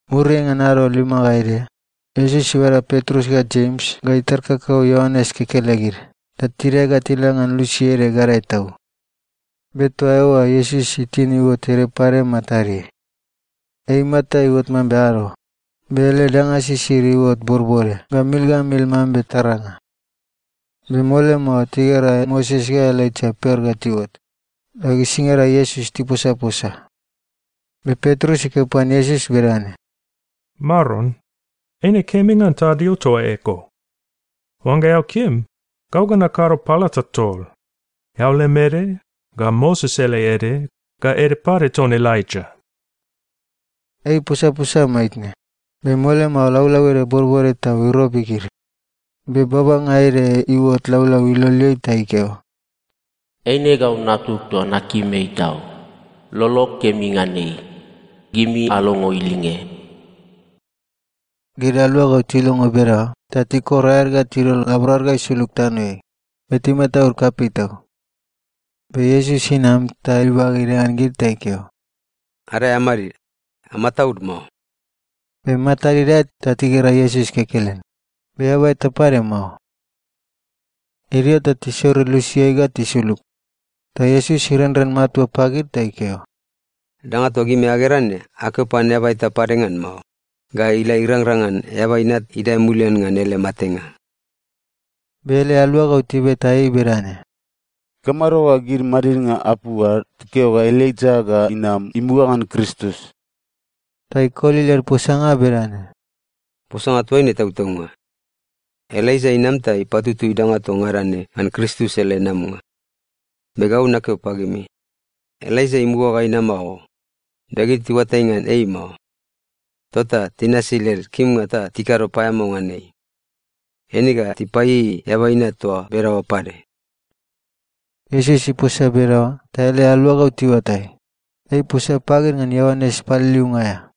Muriai ngan ado lima ga ede, Iesus ibada Petrus ga Jems ga itar kakau Ioanes kekelegid ta tidae ga tila ngan lusi ede gadae tau. Be toa eoa Iesus itin iuot ede pade matadeai. Ei imata iuot mambe ado, be ele danga sisid iuot bodbode ga mil ga mil mambe taranga. Be mole mao tigera Moses ga Elaija per ga tiuot, ta gisingada Iesus tiposaposa. Be Petrus ikeo pan Iesus bedane, “Maron, eine kemi ngan tadio toa eko. Oangga eao kim, gau ga nakado palata tol, eao lem ede, ga Moses ele ede, ga ede pade ton Elaija.” Ei iposaposa maitne, be mole mao laulau ede bodbode tau irobi gid. Be babanga ede iuot laulau iloleai ta ikeo, “Eine gau Natug toa nakim ei tau. Lolog kemi ngan ei. Gimi alongo ilinge.” Gid aluagau tilongo bedaoa ta tikor aed ga tidol laborad ga isulug tanoeai be timataud kapei tau. Be Iesus inam ta ibage idae ngan gid ta ikeo, “Adae amadid. Amataud mao.” Be matad idae ta tigera Iesus kekelen, be eaba eta pade mao. Idio ta tisorir lusiai ga tisulug, ta Iesus irenren matua pagid ta ikeo, “Danga toa gimi agera ne, akeo pan eaba eta pade ngan mao, ga ila irangrang ngan Eaba Inat idae mulian ngan ele matenga.” Be ele aluagau tibeta ei bedane, “Ikamado ga gid madidnga apu ad tikeo ga Elaija ga inam imuga ngan Kristus?” Ta ikoli led posanga bedane, “Posanga toa ne tautaunga. Elaija inam ta ipatutui danga toa ngada ne ngan Kristus ele namanga. Be gau nakeo pagimi, Elaija imuga ga inama o. Be gid tiuatai ngan ei mao. Tota tinasi led kimnga ta tikado paeamao ngan ei. Eine ga tipaieiei Eaba Inat toa bedaoa pade.” Iesus iposa bedaoa ta ele aluagau tiuatai, ei iposa pagid ngan Ioanes Paliliunga aea.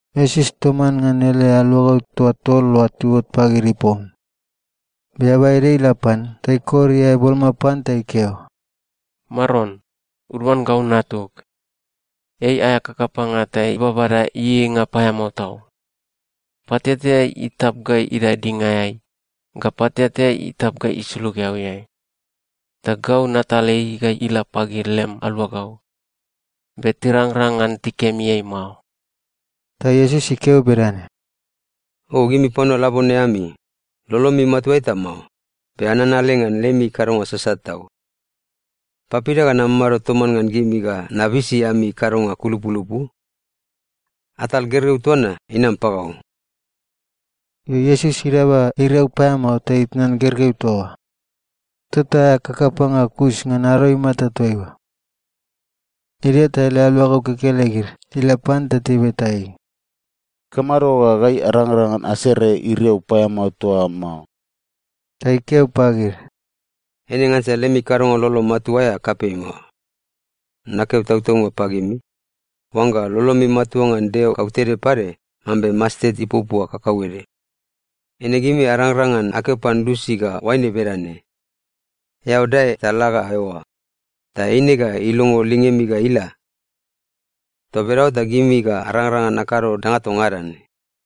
Iesus toman ngan ele aluagau toa tol oa tiuot pagid ipom. Be eaba ede ila pan ta ikor iae boloma pan ta ikeo, “Maron, uduan gau natug. Ei aea kakapanga ta ibabada ieieinga paeamao tau. Pateatea itap ga idae dingaeai ga pateatea itap ga isulug eauiai. Ta gau natal ei ga ila pagid lem aluagau, be tirangrang ngan tikemi ei mao.” Ta Iesus ikeo bedane, “O gimi panua labone ami! Lolomi matua eta mao, be ananale ngan lemi kadonga sasat tau. Papida ga namamado toman ngan gimi ga nabisi ami kadonga kulupulupu? Atal gergeu toa na inam pagau.” Io, Iesus idaba iriau paeamao ta itnan gergeu toa oa. Tota aea kakapanga kus ngan ado imata toaiua. Idio ta ele aluagau kekelegid tila pan ta tibeta ei, “Ikamado ga gai arangrang ngan serenga iriau paeamao toa oa mao?” Ta ikeo pagid, “Eine ngansa lemi kadonga lolo matua aea kapei mao. Nakeo tautaunga pagimi, oangga lolomi matua ngan Deo kautede pade, mambe mastet ipuapua kakauede, eine gimi ga arangrang ngan akeo pan lusi ga oaine bedane, ‘Eao dae ta la ga eoa,’ ta eine ga ilongo lingemi ga ila. Toa bedaoa ta gimi ga arangrang ngan akado danga toa ngada ne.”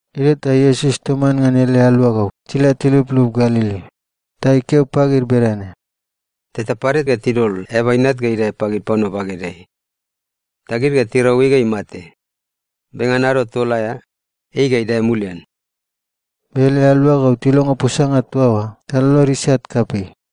Idio ta Iesus toman ngan ele alugau tila tiluplup Galili, ta ikeo pagid bedane, “Teta pade ga tidol Eaba Inat ga idae pagid panua bagedeai. Ta gid ga tirau ei ga imate, be ngan ado tol aea, ei ga idae mulian.” Be ele aluagau tilongo posanga toa oa ta lolod isat kapei.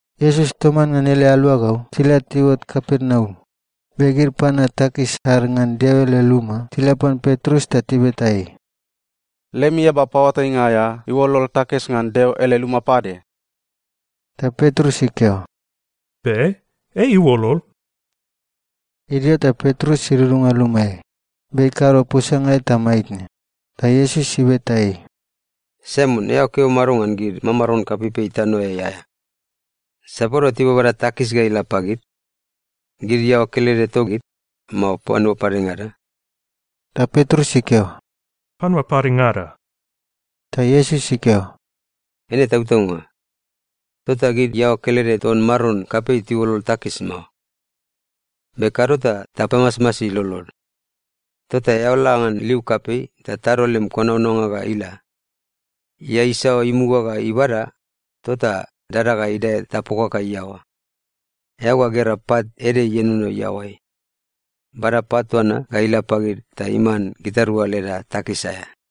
Iesus toman ngan ele aluagau tila tiuot Kapernaum, be gid panua takis ad ngan Deo ele luma tila pan Petrus ta tibeta ei, “Lemi eaba paoatainga aea iuolol takis ngan Deo ele luma pade?” Ta Petrus ikeo, “Be. Ei iuolol.” Idio ta Petrus idudunga lumaeai, be ikado posanga eta maitne, ta Iesus ibeta ei, “Saimon, eao keo mado ngan gid mamaron kapeipei tanoeai aea? Sapadua tibabada takis ga ila pagid, gid iaoa kelede togid, mao panua padengada?” Ta Petrus ikeo, “Panua padengada.” Ta Iesus ikeo, “Eine tautaunga. Tota gid iaoa kelede ton maron kapei tiuolol takis mao. Be kado ta tapamasmasi lolod. Tota eao la ngan liu kapei ta tado lem konaonanga ga ila. Ia isaoa imuga ga ibada, tota dada ga idae ta pokaka iaoa. Eao ga gera pat ede ienono iaoai. Bada pat toa na ga ila pagid ta iman gitarua leda takis aea.”